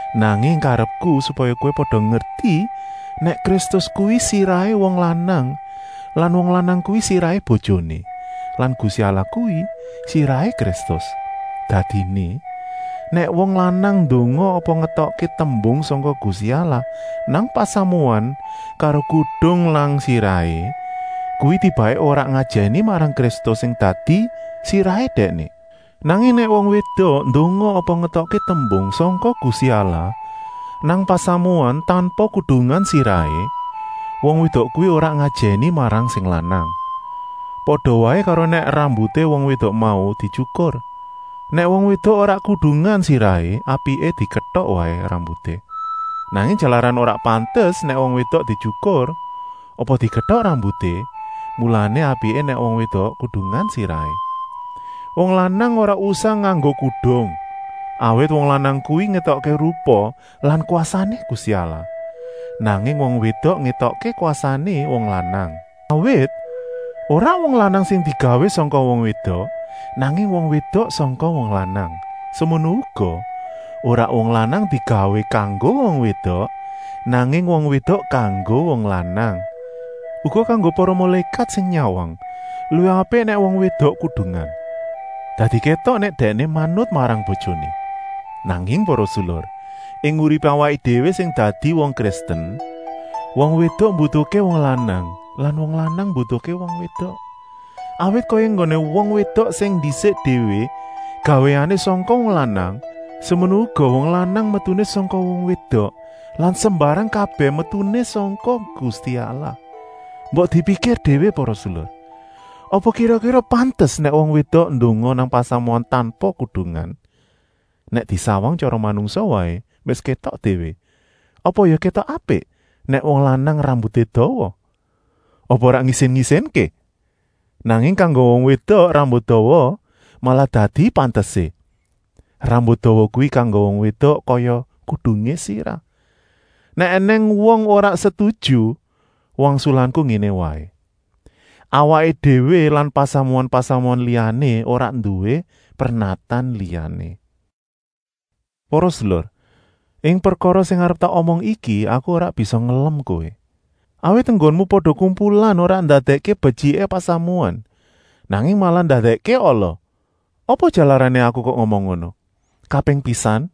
Nanging karepku supaya kowé pada ngerti nèk Kristus kuwi sirahé wong lanang lan wong lanang kuwi sirahé bojoné lan Gusti Allah kuwi sirahé Kristus. Dadiné, nèk wong lanang ndonga apa ngetokké tembung sangka Gusti Allah nang pasamuan karo kudung nang sirahé, kuwi tibaké ora ngajèni marang Kristus sing dadi sirahé dèkné. Nanging nèk wong wédok ndonga apa ngetokké tembung sangka Gusti Allah nang pasamuan tanpa kudungan sirahé, wong wédok kuwi ora ngajèni marang sing lanang, pada waé karo nèk rambuté wong wédok mau dityukur. Nèk wong wédok ora kudungan sirahé, apiké diketok waé rambuté. Nanging jalaran ora pantes nèk wong wédok dityukur, apa diketok rambuté, mulané apiké nèk wong wédok kudungan sirahé. Wong lanang ora usah nganggo kudung, awit wong lanang kuwi ngétokké rupa lan kwasané Gusti Allah. Nanging wong wédok ngétokké kwasané wong lanang. Awit, ora wong lanang sing digawé sangka wong wédok, nanging wong wédok sangka wong lanang. Semono uga, ora wong lanang digawé kanggo wong wédok, nanging wong wédok kanggo wong lanang. Uga kanggo para mulékat sing nyawang, luwih apik nèk wong wédok kudungan, dadi kétok nèk dèkné manut marang bojoné. Nanging para sedulur, ing uripé awaké déwé sing dadi wong Kristen, wong wédok mbutuhké wong lanang lan wong lanang mbutuhké wong wédok. Awit kaya enggoné wong wédok sing ndisik déwé gawéané sangka wong lanang, semono uga wong lanang metuné sangka wong wédok lan sembarang kabèh metuné sangka Gusti Allah. Mbok dipikir déwé para sedulur, apa kira-kira pantes nèk wong wédok ndonga nang pasamuan tanpa kudungan? Nèk disawang sak tyara manungsa waé wis kétok déwé: apa ya kétok apik nèk wong lanang rambuté dawa? Apa ora ngisin-isinké? Nanging kanggo wong wédok rambut dawa malah dadi pantesé. Rambut dawa kuwi kanggo wong wédok kaya kudungé sirah. Nèk ènèng wong ora setuju, wangsulanku ngéné waé: awaké déwé lan pasamuan-pasamuan liyané ora nduwé pernatan liyané. Para sedulur, ing prekara sing arep tak omong iki aku ora bisa ngelem kowé, awit enggonmu pada kumpulan ora ndadèkké betyiké pasamuan, nanging malah ndadèkké ala. Apa jalarané aku kok ngomong ngono? Kaping pisan,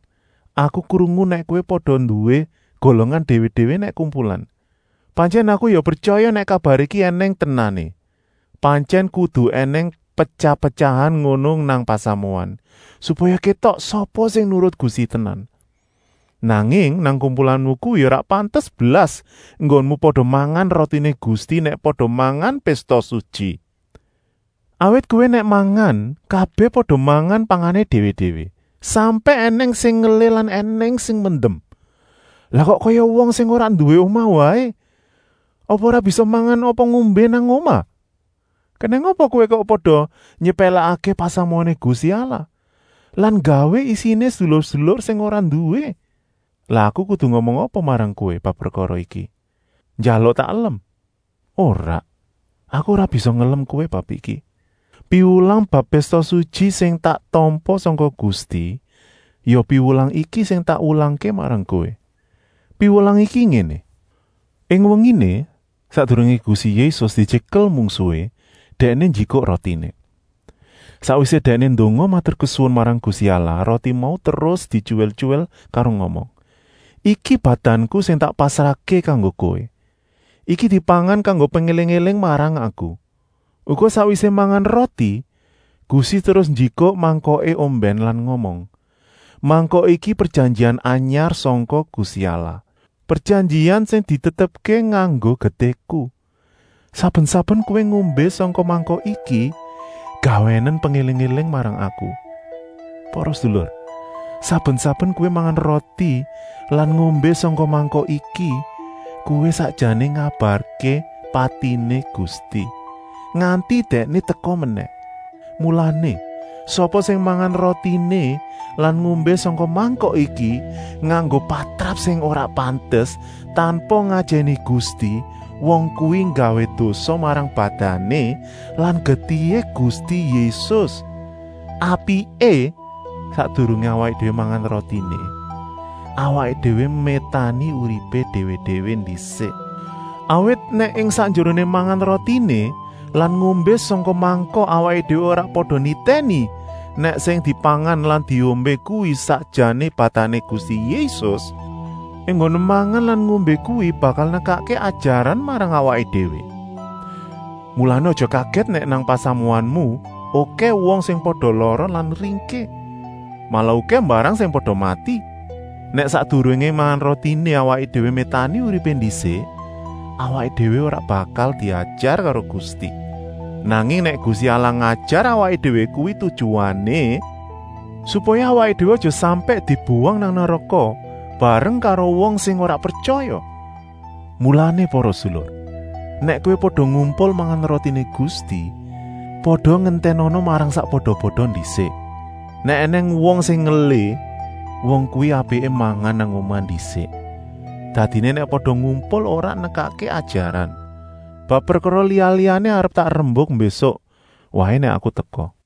aku krungu nèk kowé pada nduwé golongan déwé-déwé nèk kumpulan. Pantyèn aku ya pretyaya nèk kabar iki ènèng tenané. Pantyèn kudu ènèng petyah-petyahan ngono nang pasamuan, supaya kétok sapa sing nurut Gusti tenan. Nanging nang kumpulanmu kuwi ora pantes blas enggonmu pada mangan rotiné Gusti nèk pada mangan Pésta Sutyi. Awit kowé nèk mangan, kabèh pada mangan pangané déwé-déwé, sampèk ènèng sing ngelih lan ènèng sing mendem. Lah kok kaya wong sing ora nduwé omah waé; apa ora bisa mangan apa ngombé nang omah. Kenèng apa kowé kok pada nyepèlèkké pasamuané Gusti Allah lan nggawé isiné sedulur-sedulur sing ora nduwé? Lah aku kudu ngomong apa marang kowé bab prekara iki? Njaluk tak elem? Ora, aku ora bisa ngelem kowé bab iki. Piwulang bab Pésta Sutyi sing tak tampa sangka Gusti, ya piwulang iki sing tak wulangké marang kowé. Piwulang iki ngéné: ing wenginé, sakdurungé Gusti Yésus dityekel mungsuhé, Dèkné njikuk rotiné. Sakwisé Dèkné ndonga maturkesuwun marang Gusti Allah, roti mau terus dityuwil-tyuwil karo ngomong: “Iki badanku sing tak pasrahké kanggo kowé. Iki dipangan kanggo pengéling-éling marang Aku.” Uga sakwisé mangan roti, Gusti terus njikuk mangkoké ombèn lan ngomong: “Mangkok iki prejanjian anyar sangka Gusti Allah, prejanjian sing ditetepké nganggo getihku. Saben-saben kowé ngombé sangka mangkok iki, gawénen pengéling-éling marang Aku.” Para sedulur, saben-saben kowé mangan roti lan ngombé sangka mangkok iki, kowé sakjané ngabarké patiné Gusti, nganti Dèkné teka menèh. Mulané, sapa sing mangan rotiné lan ngombé sangka mangkok iki nganggo patrap sing ora pantes, tanpa ngajèni Gusti, wong kuwi nggawé dosa marang badané lan getihé Gusti Yésus. Apiké, sakdurungé awaké déwé mangan rotiné, awaké déwé métani uripé déwé-déwé ndisik. Awit nèk ing sakjeroné mangan rotiné lan ngombé sangka mangkok awaké déwé ora pada nitèni nèk sing dipangan lan diombé kuwi sakjané badané Gusti Yésus, enggoné mangan lan ngombé kuwi bakal nekakké ajaran marang awaké déwé. Mulané aja kagèt nèk nang pasamuanmu okèh wong sing pada lara lan ringkih, malah okèh mbarang sing pada mati. Nèk sakdurungé mangan rotiné awaké déwé métani uripé ndisik, awaké déwé ora bakal diajar karo Gusti. Nanging nèk Gusti Allah ngajar awaké déwé kuwi tujuané, supaya awaké déwé aja sampèk dibuwang nang neraka bareng karo wong sing ora pretyaya. Mulané para sedulur, nèk kowé pada ngumpul mangan rotiné Gusti, pada ngentènana marang sakpada-pada ndisik. Nèk ènèng wong sing ngelih, wong kuwi apiké mangan nang omah ndisik, dadiné nèk pada ngumpul ora nekakké ajaran. Bab prekara liya-liyané arep tak rembuk mbésuk waé nèk aku teka.